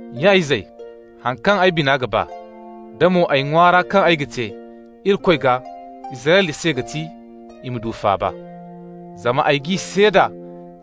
Nya-izey, haŋ kaŋ ay bina ga ba, da mo ay ŋwaara kaŋ ay ga te Irikoy gaa Israyla se ga ti: i ma du faaba. Zama ay g'i seeda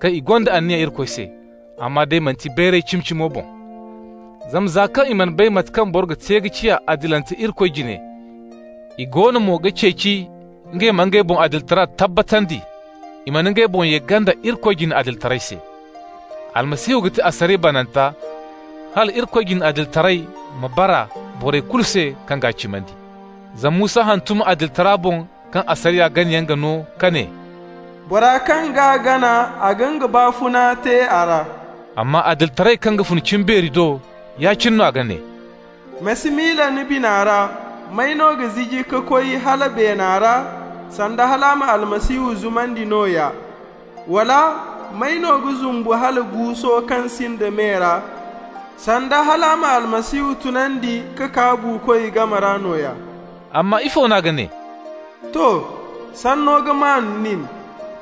kaŋ i gonda anniya Irikoy se, amma day manti bayray cimi-cimo boŋ. Zama za kaŋ i mana bay mate kaŋ boro ga te ka ciya adilante Irikoy jine, i goono mo ga ceeci ngey ma ngey boŋ adilitara tabbatandi, i mana ngey boŋ ye ganda Irikoy jine adilitaray se. Almasihu ga ti asariya bananta hala Irikoy jine adilitaray ma bara borey kulu se kaŋ g'a cimandi. Zama Musa hantum adilitara boŋ kaŋ asariya ganayaŋ ga no ka ne: «Bora kaŋ g'a gana, a ga nga baafuna te a ra.» Amma adilitaray kaŋ ga fun cimbeeri do, ya-cine no a ga ne: «Ma si miila ni bina ra: ‹May no ga ziji ka koy hala beena ra,› (sanda hal a ma Almasihu zumandi nooya)! Wala: ‹May no ga zumbu hala guuso kaŋ sinda me ra,› (sanda hal a ma Almasihu tunandi ka kaa buukoy game ra nooya)!» Amma ifo n'a ga ne? To: «Sanno ga maan nin,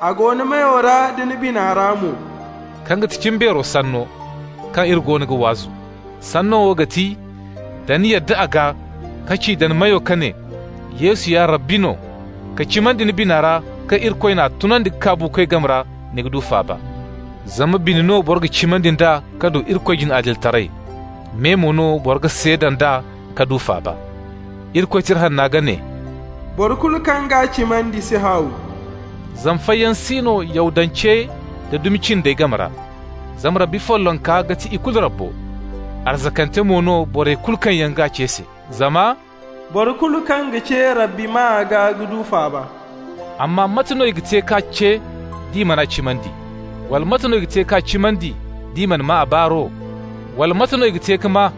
A go ni meyo da ni bina ra mo,» kaŋ ga ti cimbeero sanno kaŋ iri goono ga waazu. Sanno wo ga ti: Da ni yadda a gaa ka ci da ni meyo ka ne: «Yesu ya Rabbi no,» ka cimandi ni bina ra kaŋ Irikoy n'a tunandi ka kaa buukoy game ra, ni ga du faaba. Zama bine no boro ga cimandi nd'a ka du Irikoy jine adilitaray, me mo no boro ga seeda nd'a ka du faaba. Irikoy Tira Hanna ga ne: «Boro kulu kaŋ g'a cimandi si haaw.» Zama fayyaŋ si no Yahudancey da dumi cindey game ra, zama Rabbi follonka ga ti i kulu Rabbo, arzakante mo no borey kulu kaŋ yaŋ g'a ce se. Zama: «Boro kulu kaŋ ga ce Rabbi maa gaa ga du faaba.» Amma mate no i ga te k'a ce d'i man'a cimandi? Wala, mate no i ga te k'a cimandi d'i mana maa a baaro? Wala, mate no i ga te ka maa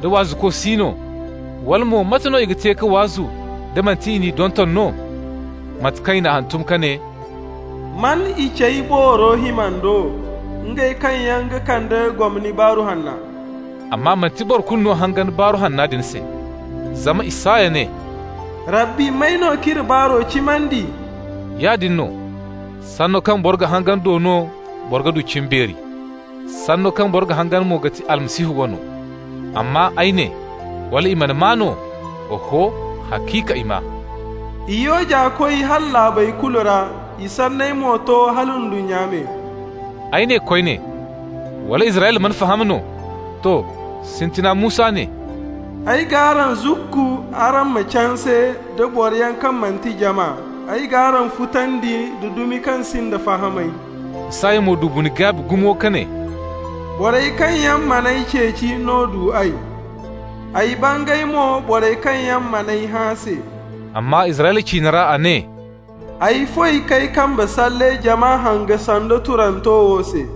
da waazuko si no? Wala mo, mate no i ga te ka waazu da manti i n'i donton no? Mate kaŋ i n'a hantum ka ne: «Man i cey booro himando, Ngey kaŋ yaŋ ga kande gomni Baaru Hanna!» Amma manti boro kulu no hangan Baaru Hanna din se. Zama Isaya ne: «Rabbi, may no k'iri baaro cimandi?» Yaadin no, sanno kaŋ boro ga hangan do no boro ga du cimbeeri, sanno kaŋ boro ga hangan mo ga ti Almasihu wano. Amma ay ne: Wala i mana maa no? Oho, haciika, i maa: «I yooja koy hala laabey kulu ra, I sanney mo to hala ndunnya me.» Ay ne koyne: Wala Israyla mana faham no? To, sintina Musa ne: «Ay g'araŋ zukku araŋ ma canse nda boroyaŋ kaŋ manti jama. Ay g'araŋ futandi nda dumi kaŋ sinda fahamay.» Isaya mo du bine-gaabi gumo ka ne: «Borey kaŋ yaŋ mana ay ceeci no du ay, Ay bangay mo borey kaŋ yaŋ man'ay hã se.» Amma Israyla ciine ra a ne: «Ay foy k'ay kambe salle jama hanga sando turanto wo se.»